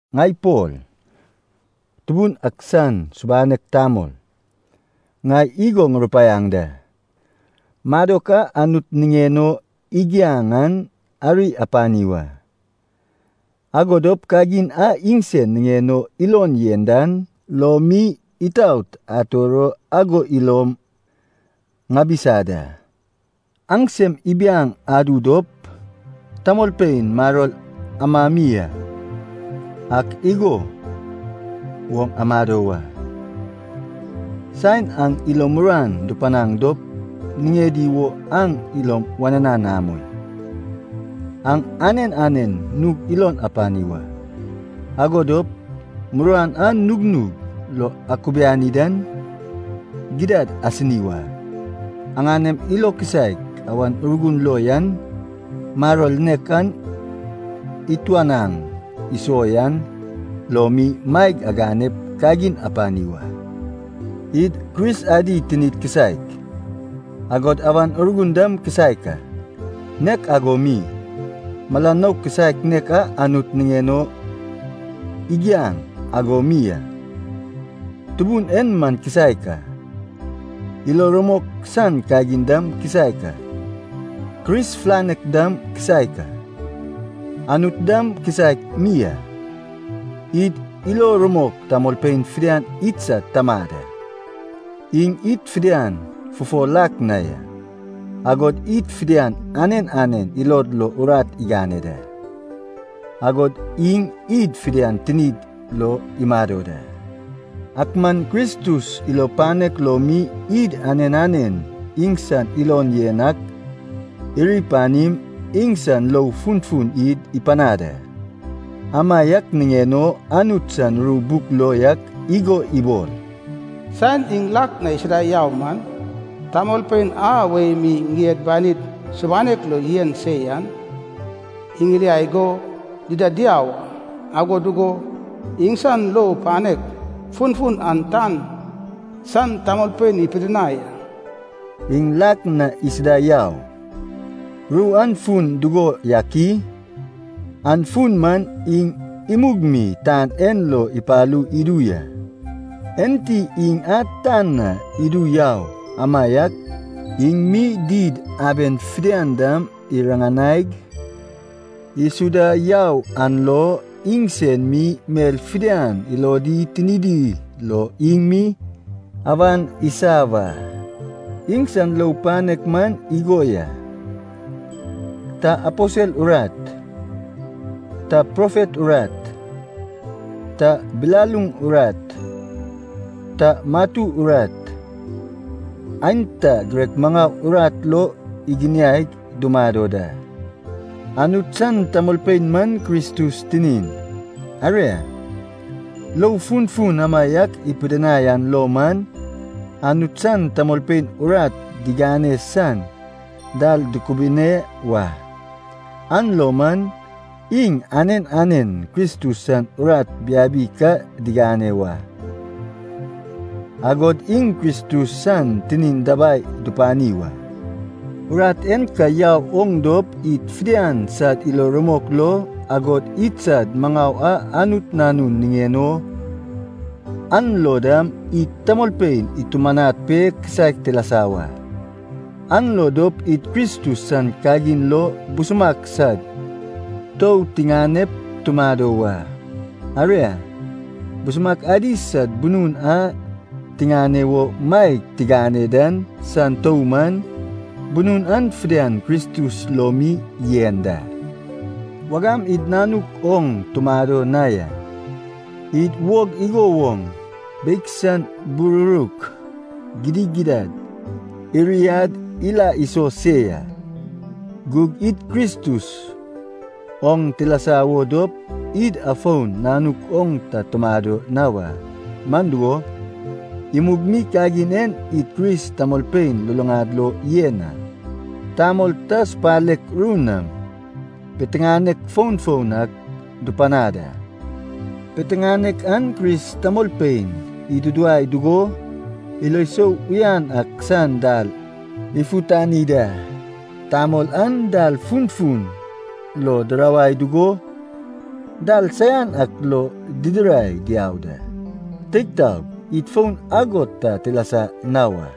Ŋai Pol, Tubun ak san subanek tamol, ŋai igo ŋurupaiaŋ da. Madok a Anut niŋen o igiaŋ an ari apani wa. Ago dop kagin a iŋsen niŋen o ilon yen dan lo mi itaot ator o ago ilom ŋabisa da. Aŋ sem ibiaŋ adu dop tamolpein maror amami ak igo woŋ amado wa. Saen aŋ ilo muruan dupanaŋ dop niŋedi wo aŋ ilom wananan amoi. Aŋ anen anen nug ilon apani wa, ago dop muruan a nugnug lo akubiani dan, gidad asini wa. Aŋanem ilo kisaek Awan Urgun lo yan, maror nek a ituanaŋ iso yan lo mi maeg aganep kagin apani wa. Id Kris adi tinid kisaek, agod Awan Urgun dam kisaek a. Nek ago mi, mala nouk kisaek nek a Anut niŋen o igiaŋ ago mi a. Tubun en man kisaek a. Ilo rumok san kagin dam kisaek a, Kris filanek dam kisaek a. Anut dam kisaek mi a, id ilo rumok tamolpein fidian idsad Tamad a. Iŋ id fidian fufo lak na ya, agod id fidian anen anen ilod lo urat igane da. Agod iŋ id fidian tinid lo imado da. Ak man Kristus ilo panek lo mi id anen anen iŋsan ilon yen ak iri panim, iŋsan lou funfun id ipanad a. Amaiak niŋen o Anut san ru buk lo yak igo ibol, “Saen iŋ lak na isuda yau man, tamolpein a wei mi ŋied banid subanek lo yen se yan iŋiliai go dida diau a. Ago dugo iŋsan lou panek funfun an tan san tamolpein ipidinai a.” (“Iŋ lak na isuda yau” ru an fun dugo yak i? An fun man iŋ imug mi tan en lo ipalu idu ya. Enti iŋ a tan na idu yau amaiak, iŋ mi did aben fidian dam iriŋanaig isuda yau an lo, iŋsen mi mel fidian ilodi tinidi lo iŋ mi awan isa wa.) Iŋsan lou panek man igo ya. Ta aposel urat, ta profet urat, ta bilaluŋ urat, ta matu urat, aenta girek maŋau urat lo iginiaig dumado da. Anut san tamolpein man Kristus tinin. Aria, lou funfun amaiak ipidinai an lo man, Anut san tamolpein urat digane san dal dukubune wa. An lo man, iŋ anen anen Kristus san urat biabi ka digane wak, agod iŋ Kristus san tinin dabai dupani wa. Urat en ka yau woŋ dop id fidian sad ilo rumok lo, agod idsad maŋau a Anut Nanun niŋen o an lo dam, id tamolpein itumanad pe kisaek tilasa wa. An lo dop id Kristus san kagin lo busumak sad tou tiŋanep tumado wa. Aria, busumak adi sad bunun a tiŋane wo maeg tigane dan san tou man, bunun an fidian Kristus lo mi yen da. Wagam id nanuk oŋ tumado na ya, id wog igo woŋ beig san bururuk gidigidad iriad ila iso se ya. Gug id Kristus oŋ tilasa wo dop, id afon nanuk oŋ ta tumado na wa. Man dugo, imug mi kagin en id Kris tamolpein luluŋad lo yen a. Tamol ta supalek ru nam piteŋanek foun foun ak dupanad a. Piteŋanek an Kris tamolpein iduduwai dugo ilo sou uyan ak san dal ifutani da. Tamol an dal funfun lo dirawai dugo dal saian ak lo didirai diau da. Teig taog, id fon ago ta tilasa na wa.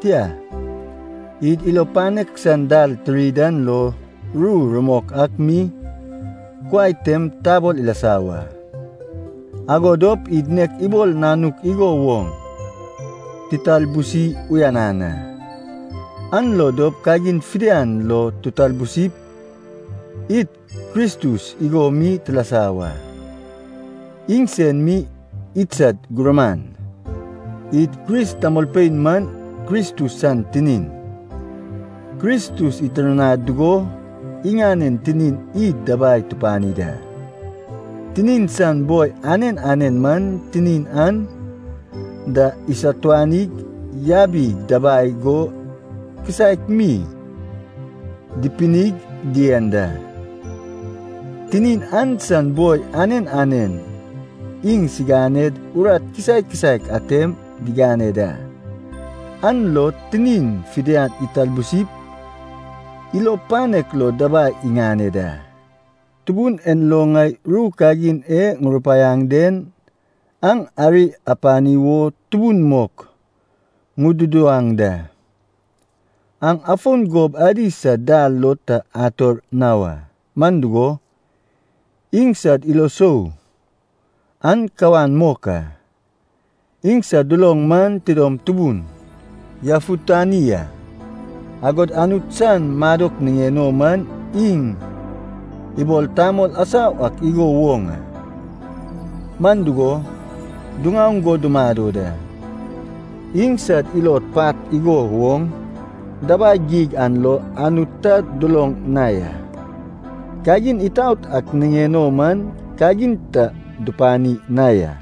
Tia, id ilo panek san dal tiri dan lo ru rumok ak mi kuai tem tabol ilasa wa. Ago dop id nek ibol nanuk igo woŋ titalbusi uyanan a. An lo dop kagin fidian lo titalbusip, id Kristus igo mi tilasa wa. Iŋsen mi idsad gurman. Id Kris tamolpein man Kristus san tinin. Kristus itirnad dugo iŋanen tinin id dabai tupani da. Tinin san boi anen anen man tinin an da isatuanig yabig dabai go kisaek mi dipinig dien da. Tinin an san boi anen anen iŋsiŋaned urat kisaek kisaek atem digane da, an lo tinin fidian italbusip ilo panek lo dabai iŋane da. Tubun en lo ŋai ru kagin e ŋurupaiaŋ den aŋ ari apani wo tubun mok ŋududuwaŋ da. Aŋ afon gob adi sad dal lo ta ator na wa. Man dugo, iŋsad ilo sou an kawan mok a. Iŋsad duloŋ man tidom tubun yafutani a, agod Anut san madok niŋen o man iŋ ibol tamol asau ak igo woŋ a. Man dugo, diŋaoŋ go dumado da. Iŋsad ilod pat igo woŋ dabai geig an lo Anut ta duloŋ na ya. Kagin itaot ak niŋen o man kagin ta dupani na ya,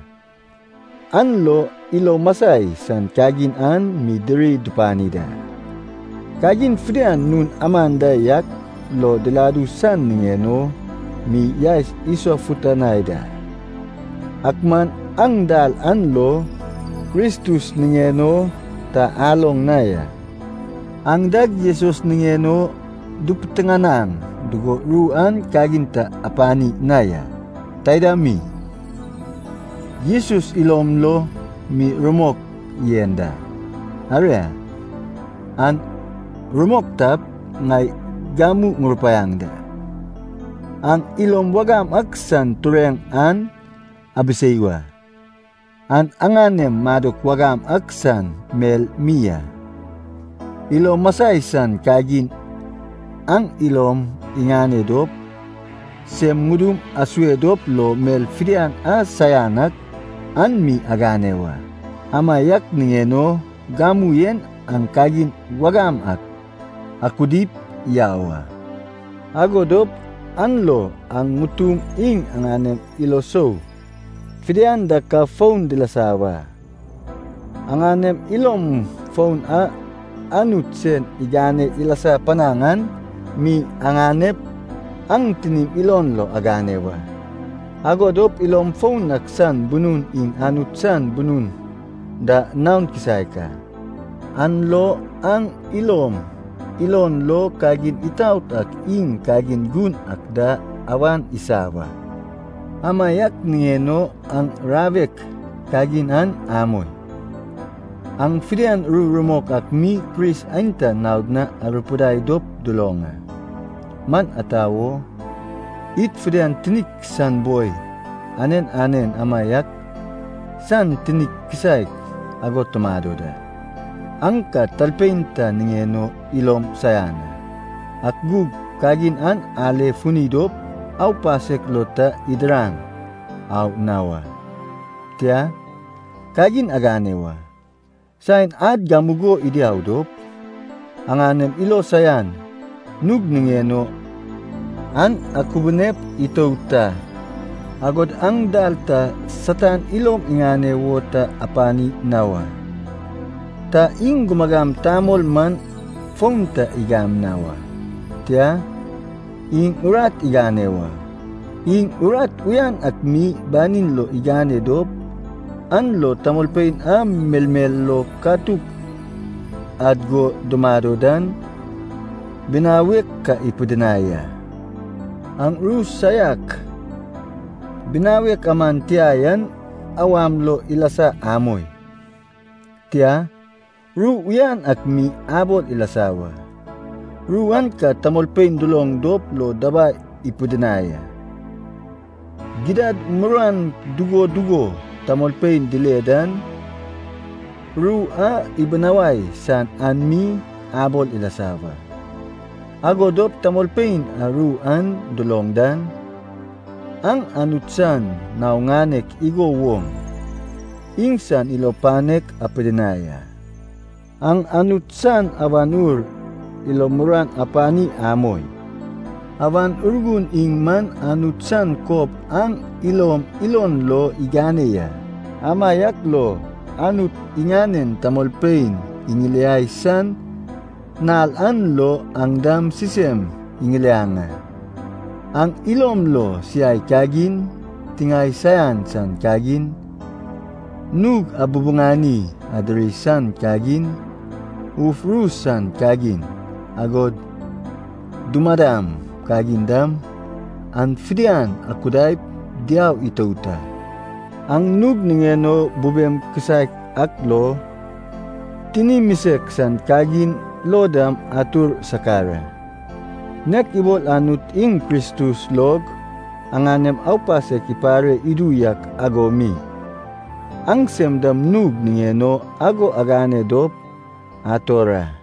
an lo ilo masai san kagin an mi diri dupani da. Kagin fidian nun aman da yak lo diladu san niŋen o mi yaes isofutanai da. Ak man aŋ dal an lo Kristus niŋen o ta aloŋ na ya! Aŋ dag Jesus niŋen o dupiteŋanaŋ dugo ru an kagin ta apani na ya. Taida mi, Jesus ilon lo mi ru rumok yen da. Aria, an rumok tap, ŋai gamu ŋurupaiaŋ da, aŋ ilom wagam ak san tureŋ an abisei wa. An aŋanem madok wagam ak san mel mi a. Ilo masai san kagin an ilom iŋane dop, sem ŋudum asue dop lo mel fidian a saian ak an mi agane wa. Amaiak niŋen o gamu en aŋ kagin wagam an akudip yau a. Ago dop an lo aŋ ŋutum iŋ aŋanem ilo sou fidian da ka foun dilasa wa. Aŋanem ilom foun a Anut sen igane ilasa panaŋ an mi aŋanep aŋ tinim ilon lo agane wa. Ago dop ilom foun ak san bunun iŋ Anut san bunun da naon kisaek a, an lo aŋ ilom ilon lo kagin itaot ak iŋ kagin gun ak da awan isa wa. Amaiak niŋen o aŋ rawek kagin an amoi. Aŋ fidian ru rumok ak mi Kris aenta naod na arupidai dop duloŋ a. Man ata wo, id fidian tinik san boi anen anen amaiak san tinik kisaek ago tumado da. Aŋ ka talpein ta niŋen o ilom saian a. Ak gug kagin an ale funi dop aupasek lo ta idiraŋ au na wa. Tia, kagin agane wa, saen ad gamugo idiau dop, aŋanem ilo saian nug niŋen o an akubunep itout a. Agod aŋ dal ta Satan ilom iŋane wo ta apani na wa. Ta iŋ gumagam tamol man fon ta igam na wa, tia, iŋ urat igane wa. Iŋ urat uyan ak mi banin lo igane dop, an lo tamolpein a melmel lo katuk ad go dumado dan binawek ka ipidinai a. Aŋ ru saiak binawek aman tia yan awam lo ilasa amoi. Tia, ru uyan ak mi abol ilasa wa, ru an ka tamolpein duloŋ dop lo dabai ipidinai a. Gidad muruan dugo dugo tamolpein dile dan, ru a ibinawai san an mi abol ilasa wa. Ago dop tamolpein a ru an duloŋ dan, aŋ Anut san nao ŋanek igo woŋ iŋsan ilo panek apidinai a. Aŋ Anut san Awan Ur ilo muruan apani amoi. Awan Urgun iŋ man Anut san kob aŋ ilom ilon lo igane ya, amaiak lo Anut iŋanen tamolpein iŋiliai san nal an lo aŋ dam sisem iŋiliaŋ a. Aŋ ilom lo siai kagin, tiŋae saian san kagin, nug abubuŋani adiri san kagin, uf ru san kagin, agod dumadam kagin dam, an fidian akudaip diau itout a. Aŋ nug niŋen o bubem kisaek ak lo, tini misek san kagin lo dam atur sakar a. Nek ibol Anut iŋ Kristus log aŋanem aupasek ipare idu yak ago mi, aŋsem dam nug niŋen o ago agane dop ator a.